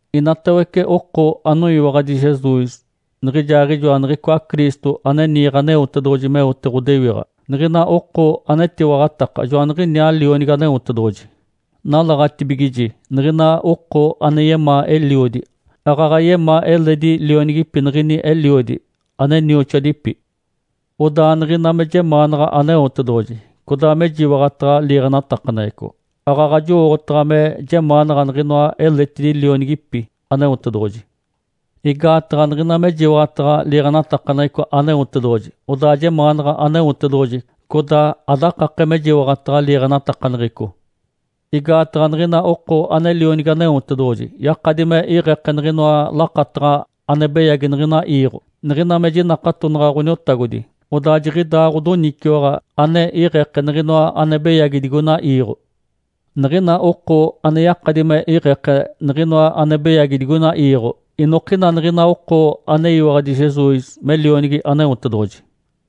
Inatawece oko anoyiwaɡ̶adi Jesus niɡ̶ijaaɡ̶ijoa niɡ̶icoa Cristo, ane niiɡ̶e Aneotedoɡ̶oji meote ɡ̶odewiɡ̶a, niɡ̶ina oko anetiwaɡ̶ataka joaniɡ̶iniaa lionigi Aneotedoɡ̶oji. Nalaɡ̶atibigiji niɡ̶ina oko ane yemaa eliodi, aaɡ̶aɡ̶a yemaa eledi lionigipi niɡ̶ini eliodi, ane nioxoadipi. Odaa niɡ̶ina me jemaanaɡ̶a Aneotedoɡ̶oji, codaa mejiwaɡ̶ataɡ̶a liiɡ̶enatakaneɡ̶eco, aaɡ̶aɡ̶a jowooɡ̶otaɡ̶a me jemaanaɡ̶a niɡ̶inoa eletidi lionigipi Aneotedoɡ̶oji. Igaataɡ̶a niɡ̶ina mejiwaɡ̶ataɡ̶a liiɡ̶enatakaneɡ̶eco Aneotedoɡ̶oji, odaa jemaanaɡ̶a Aneotedoɡ̶oji, codaa adakake mejiwaɡ̶ataɡ̶a liiɡ̶enatakaneɡ̶eco. Igaataɡ̶a niɡ̶ina oko ane lionigi Aneotedoɡ̶oji yakadi me iɡ̶eke niɡ̶inoa lakataɡ̶a ane beyagi niɡ̶ina iiɡ̶o. Niɡ̶ina me jinakatonaɡ̶a Ǥoniotagodi, odaa jiɡ̶idaa ɡ̶odoniciwaɡ̶a ane iɡ̶eke niɡ̶inoa ane beyagi digoina iiɡ̶o. Niɡ̶ina oko ane yakadi me iɡ̶eke niɡ̶inoa ane beyagi digoina iiɡ̶o, inokina niɡ̶ina oko aneyiwaɡ̶adi Jesus me Lionigi Aneotedoɡ̶oji.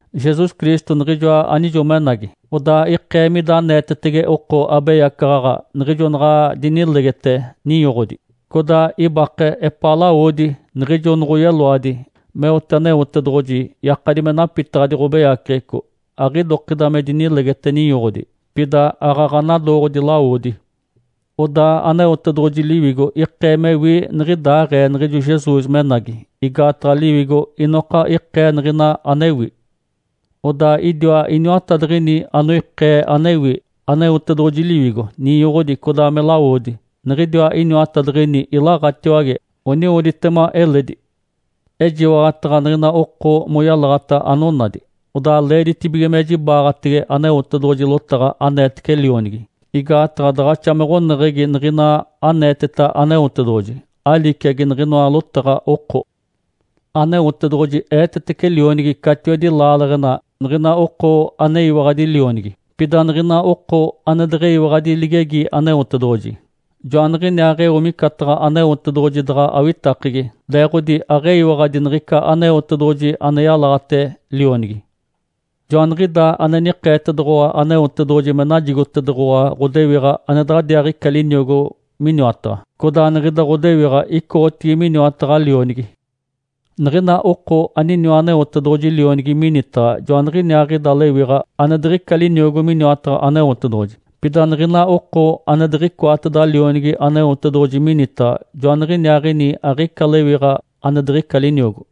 Jesus Cristo niɡ̶ijoa anijo menagi, odaa ikee mida aneetetege oko abeyacaɡ̶aɡ̶a niɡ̶ijo naɡ̶a dinilegete ninyoɡ̶odi, codaa ibake epaa lawodi niɡ̶ijo noɡ̶oyeloadi meote Aneotedoɡ̶oji yakadi me napitaɡ̶adi ɡ̶obeyaceɡ̶eco. Aɡ̶idokida me dinilegete ninyoɡ̶odi, pida aaɡ̶aɡ̶a nadooɡ̶odi lawodi. Odaa Aneotedoɡ̶oji Liwigo ikee mewi niɡ̶idaaɡ̶ee niɡ̶ijo Jesus menagi, igaataɡ̶a Liwigo inoka ikee niɡ̶ina anewi. Odaa idiwa iniwatadiɡ̶ini anoikee anewi; Aneotedoɡ̶oji Liwigo, ninyoɡ̶odi, codaa me lawodi. Niɡ̶idiwa iniwatadiɡ̶ini ilaɡ̶atiwage, oniwoditema eledi. Ejiwaɡ̶ataɡ̶a niɡ̶ina oko moyalaɡ̶ata anonadi. Odaa leeditibige me jibaɡ̶atege Aneotedoɡ̶oji lotaɡ̶a aneetece Lionigi, igaataɡ̶a daɡ̶axa me ɡ̶oneɡ̶egi niɡ̶ina aneeteta Aneotedoɡ̶oji, aliciagi niɡ̶inoa lotaɡ̶a oko. Aneotedoɡ̶oji eetetece Lionigi catiwedi laaleɡ̶ena niɡ̶ina oko aneyiwaɡ̶adi Lionigi. Pida niɡ̶ina oko ane deɡ̶eyiwaɡ̶adi ligegi Aneotedoɡ̶oji, joaniɡ̶iniaaɡ̶eo micataɡ̶a Aneotedoɡ̶oji daɡ̶a awitakegi, leeɡ̶odi aɡ̶eyiwaɡ̶adi niɡ̶ica Aneotedoɡ̶oji ane yalaɡ̶ate Lionigi. Joaniɡ̶idaa ane nikeetedoɡ̶owa Aneotedoɡ̶oji me najigotedoɡ̶owa ɡ̶odewiɡ̶a ane daɡ̶adiaaɡ̶ica liniogo miniwataɡ̶a, codaa niɡ̶ida ɡ̶odewiɡ̶a icoɡ̶otigi miniwataɡ̶a Lionigi. Niɡ̶ina oko aniniwa Aneotedoɡ̶oji Lionigi minitaɡ̶a joaniɡ̶iniaaɡ̶ida lewiɡ̶a ane diɡ̶ica liniogo miniwataɡ̶a Aneotedoɡ̶oji. Pida niɡ̶ina oko ane diɡ̶icoateda Lionigi Aneotedoɡ̶oji minitaɡ̶a, joaniɡ̶iniaaɡ̶ini aɡ̶ica lewiɡ̶a ane diɡ̶ica liniogo.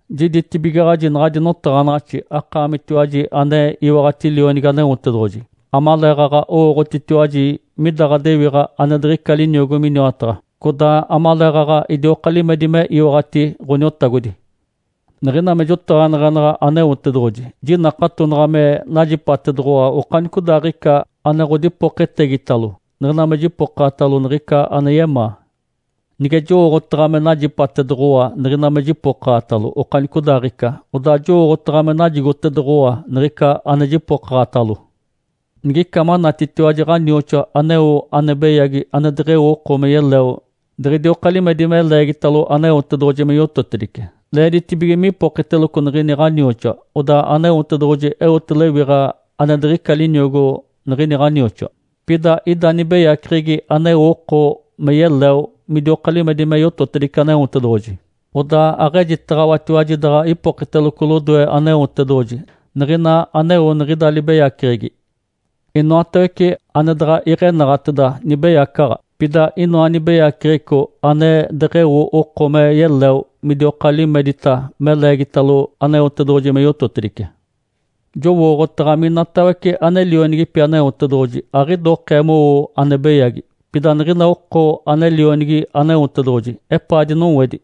Jiditibigaɡ̶aji naɡ̶adi notaɡ̶anaɡ̶axi akaamitiwaji ane iwaɡ̶ati Lionigi Aneotedoɡ̶oji, amaleeɡ̶aɡ̶a owooɡ̶otitiwaji mida ɡ̶adewiɡ̶a ane diɡ̶ica liniogo miniwataɡ̶a, codaa amaleeɡ̶aɡ̶a idioka limedi me iwaɡ̶ati Ǥoniotagodi. Niɡ̶ina me jotaɡ̶aneɡ̶enaɡ̶a Aneotedoɡ̶oji, jinakatonaɡ̶a me najipatedoɡ̶owa okanicodaaɡ̶ica ane ɡ̶odipoketegitalo, niɡ̶ina me jipokaɡ̶atalo niɡ̶ica ane yemaa. Nige jowooɡ̶otaɡ̶a me najipatedoɡ̶owa niɡ̶ina me jipokaɡ̶atalo okanicodaaɡ̶ica, Odaa jowooɡ̶otaɡ̶a me najigotedoɡ̶owa niɡ̶ica ane jipokaɡ̶atalo. Nigica manatitiwaji ɡ̶anioxoa aneo ane beyagi ane deɡ̶eo oko me yeleo diɡ̶idioka limedi me leegitalo Aneotedoɡ̶oji me yototedice, leeditibige mipokiteloco niɡ̶ini ɡ̶anioxoa, odaa Aneotedoɡ̶oji eote lewiɡ̶a ane diɡ̶ica liniogo niɡ̶ini ɡ̶anioxoa. Pida ida nibeyaceɡ̶egi aneo oko me yeleo midioka limedi me yototedice Aneotedoɡ̶oji. Odaa aɡ̶ejitaɡ̶awatiwaji daɡ̶a ipokiteloco lodoe Aneotedoɡ̶oji niɡ̶ina aneo niɡ̶ida libeyaceɡ̶egi. Inoatawece ane daɡ̶a iɡ̶enaɡ̶ateda, nibeyacaɡ̶a. Pida inoa nibeyaceɡ̶eco ane deɡ̶eo oko me yeleo midioka limedita me leegitalo Aneotedoɡ̶oji me yototedice. Jowooɡ̶otaɡ̶a minatawece ane lionigipi Aneotedoɡ̶oji aɡ̶idokee mowo ane beyagi. Pida niɡ̶ina oko ane lionigi Aneotedoɡ̶oji epaa dinowedi,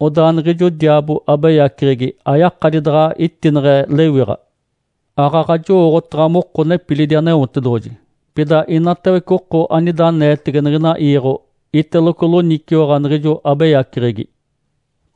odaa niɡ̶ijo diaabo, abeyaceɡ̶egi, ayakadi daɡ̶a itineɡ̶e lewiɡ̶a. Aaɡ̶aɡ̶a jowooɡ̶otaɡ̶a moko nepilidi Aneotedoɡ̶oji, pida inatawece oko anida aneetege niɡ̶ina iiɡ̶o iteloco loniciwaɡ̶a niɡ̶ijo abeyaceɡ̶egi.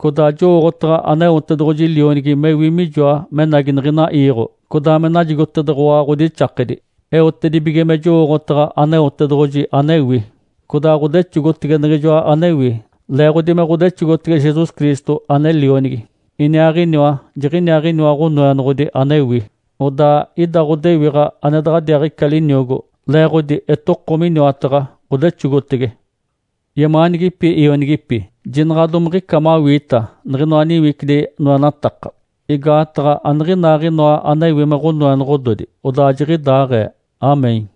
Codaa jowooɡ̶otaɡ̶a Aneotedoɡ̶oji Lionigi mewi mijoa menagi niɡ̶ina iiɡ̶o, codaa me najigotedoɡ̶owa ɡ̶odixakedi, eotedibige me jowooɡ̶otaɡ̶a Aneotedoɡ̶oji anewi. Codaa ɡ̶odexogotege Niɡ̶ijoa anewi, leeɡ̶odi me ɡ̶odexogotege Jesus Cristo ane Lionigi. Iniaaɡ̶iniwa, jiɡ̶iniaaɡ̶iniwa Ǥonoenoɡ̶odi anewi, odaa ida ɡ̶odewiɡ̶a ane daɡ̶adiaaɡ̶ica liniogo, leeɡ̶odi etoko miniwataɡ̶a, ɡ̶odexogotege. Yemaanigipi ionigipi, jinaɡ̶a domiɡ̶ica mawiita niɡ̶inoa niwicidi noenataka, igaataɡ̶a aniɡ̶inaaɡ̶inoa anewi me ɡ̶onoenoɡ̶ododi. Odaa jiɡ̶idaaɡ̶ee. (Amém).